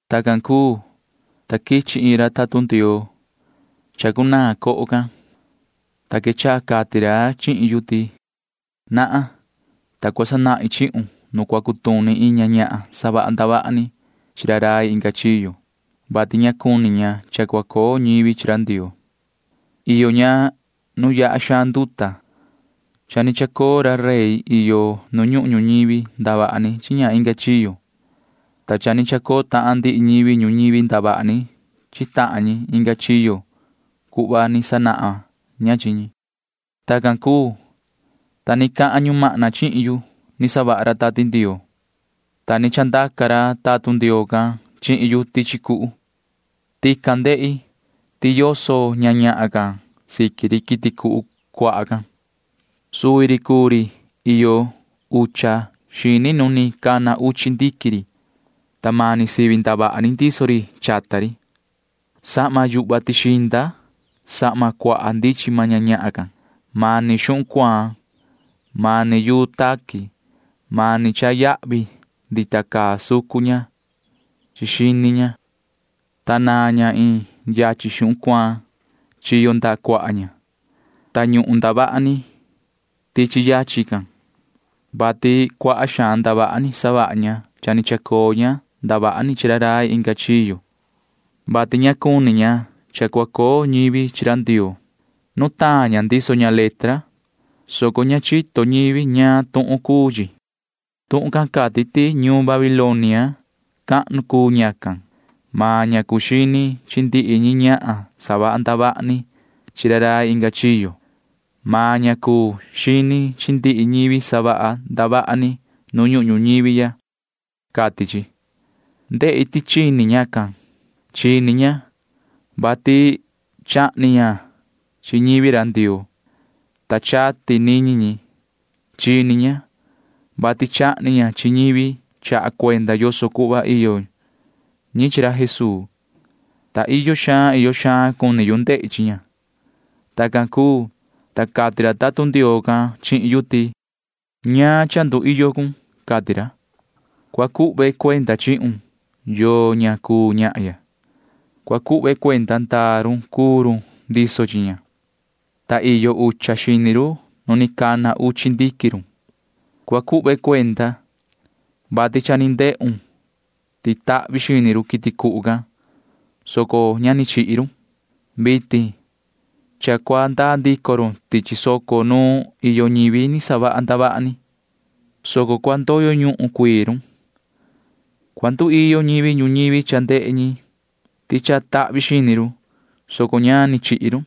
Tacan cuu, ta quichi iin ra tatun Ndioo chacunaan coho can, ta quechaha cati ra chihin yu ti: ―Nahan, ta cua sanahin chihun nu cua cutuni iin ña ñahan savaha ndavaha ni chi ra rai inga chiyo, [vati ña cuni ña cha cua coo ñivi chi ra Ndioo]. Iyo ña nu yaha xaan nduta. Cha ni chacoo ra rey iyo nu ñuhun ñuñivi ndavaha ni chi ña inga chiyo, ta cha ni chacoo tahan ndihi ñivi ñuñivi ndavaha ni chi tahan ñi inga chiyo cuhva ni sanahan ña chi ñi. Tacan cuu, ta ni cahan ra ñumahna chihin yu ni savaha ra Tati Ndioo, ta ni chandaca ra tatun Ndioo can chihin yu tichi cuhu. Tican ndehi ti yoso ñahan can siqui ri quiti cuhu cuaha can. Suvi ri cuu ri iyo ucha xini nu ni cana uchi ndiquin ri, ta mani sivi ndavaha ni ndiso ri chata ri. Sahma yuhva tixinda sahma cuaha ndichin maan ña ñahan can. Mani xuhun cuaan, mani yuu taqui, mani cha yahvi ndita caa sucun ña xini ña, ta naan ña iin yachin xuhun cuaan chi ndaha cuaha ña, ta ñuhun ndavaha ni yachin can, vati cuaha xaan ndavaha ni savaha ña cha ni chacoo ña ndavaha ni chi ra rai inga chiyo, [vati ña cuni ña cha cua coo ñivi chi ra Ndioo]. Nutaan ña ndiso ña letra, soco ña chito ñivi ñaan tuhun cuu chi. Tuhun can cati ti ñuun Babilonia cahnu cuu ñacan. Maan ña cuu xini chi ndihi ñi ñahan savaha ndavaha ni chi ra rai inga chiyo. Maan ña cuu xini chi ndihi ñivi savaha ndavaha ni nu ñuhun ñuñivi ya, cati chi. Ndehi ti chini ñacan. Chini ña, vati chahni ña chi ñivi ra Ndioo, ta chati niñi ñi. Chini ña, vati chahni ña chi ñivi chaha cuenda yoso cuhva iyo ñi chi ra Jesuu, ta iyo xaan iyo xaan cuni yu ndehi chi ña. Tacan cuu, ta cati ra tatun Ndioo can chihin yu ti: ―Ña cua cuiyo con. Cua cuhve cuenda chihun yoo ña cuu ñahya. Cua cuhve cuenda ndaa run cuu run ndiso chi ña, ta iyo ucha xini run nu ni cana uchi ndiquin run. Cua cuhve cuenda, vati cha ni ndehun ti tahvi xini run quiti cuhu can, soco ña ni chihi run. Vitin cha cua ndaa ndico run tichi soco nu iyo ñivi ni savaha ndavaha ni, soco cua ndoyo ñuhun cuii run. Cua nduiyo ñivi ñuñivi cha ndehe ñi ti cha tahvi xini run, soco ña ni chihi run,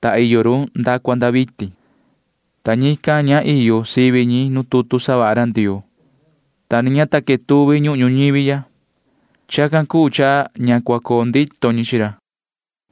ta iyo run nda cua nda vitin, ta ñican ña iyo sivi ñi nu tutu savaha ra Ndioo, ta ni ña ta quetuvi ñuhun ñuñivi ya. Chacan cuu cha ña cua coo ndito ñi chi ra.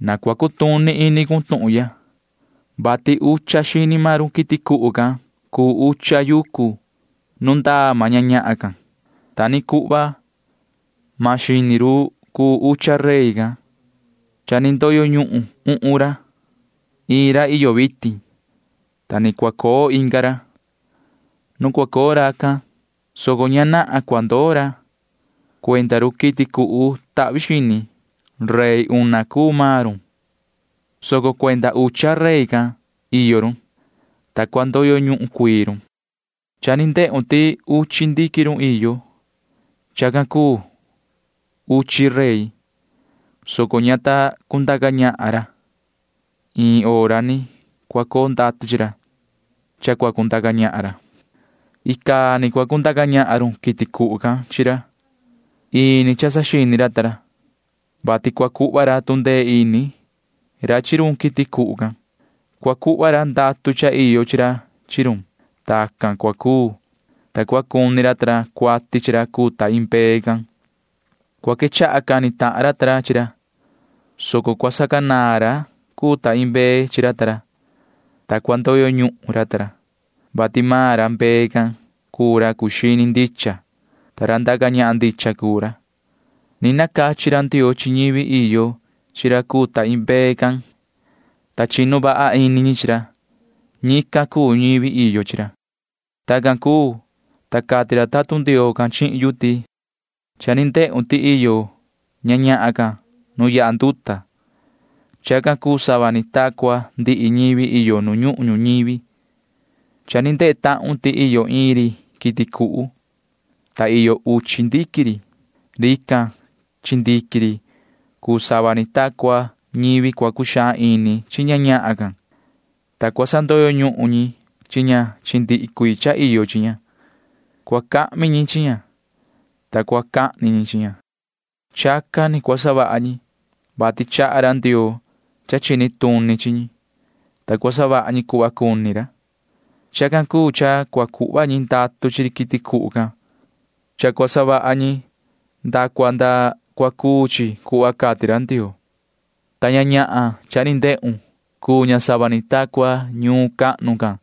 ’Na cua cutuni ini cun tuhun ya, vati ucha xini maan run quiti cuhu can cuu ucha yucu nu ndaa maan ña ñahan can. Ta ni cuhva maan xini run cuu ucha rey. Cha ni ndoyo ñuhun uhun ra. Iin ra iyo vitin, ta ni cua coo inga ra. Nu cua coo racan, soco ña nahan cua ndoo ra. Cuenda run quiti cuhu tahvi xini―rey una cuu maan run, soco cuenda ucha rey can iyo run, ta cua ndoyo ñuhun cuii run. ’Cha ni ndehun ti uchi ndiquin run iyo. Chacan cuu uchi rey, soco ña ta cundaca ñahan ra. Iin hora ni cua coo ndatu chi ra, ta cua cundaca ñahan ra. Icaa ni cua cundaca ñahan run quiti cuhu can chi ra. Ini cha saxini ra ta ra, vati cua cuhva ra tu ndee ini ra chi run quiti cuhu can. Cua cuhva ra ndatu cha iyo chi ra chi run. Tacan cua cuu, ta cua cuni ra ta ra cuati chi ra cuu ta iin mbee can. Cua quechaha cani tahan ra ta ra chi ra, soco cua sacanaan ra cuu ta iin mbee chi ra ta ra, [ta cua ndoyo ñuhun ra ta ra,] vati maan ra mbee can cuu ra cuu xini ndicha, ta ra ndaca ñahan ndicha cuu ra. Ni nacachi ra Ndioo chi ñivi iyo chi ra cuu ta iin mbee, ta chinu vaha ini ñi chi ra. [Ñican cuu ñivi iyo chi ra.] Tacan cuu, ta cati ra tatun Ndioo can chihin yu ti: ―Cha ni ndehun ti iyo ña ñahan can nu yaha nduta. Chacan cuu sava ni ta cua ndihi ñivi iyo nu ñuhun ñuñivi. Cha ni ndehe tahun ti iyo iin ri quiti cuhu, ta iyo uchi ndiquin ri. Rican chi ndiquin ri cuu sava ni ta cua ñivi cua cuxaan ini chi ña ñahan can, ta cua sandoyo ñuhun ñi chi ña chi ndihi cuii cha iyo chi ña. Cua cahmi ñi chi ña, ta cua cahni ñi chi ña. Chacan ni cua savaha ñi, vati chaha ra Ndioo cha chini tuni chi ñi, ta cua savaha ñi cuhva cuni ra. Chacan cuu cha cua cuhva ñi ndatu chi ri quiti cuhu can. Chacan cua savaha ñi nda cua nda cua cuu chi cuhva cati ra Ndioo, ta ña ñahan cha ni ndehun―cuu ña sava ni ta cua ñuun cahnu can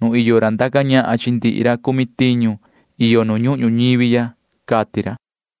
nu iyo ra ndaca ñahan chi ndihi ra cumi tiñu iyo nu ñuhun ñuñivi ―cati ra.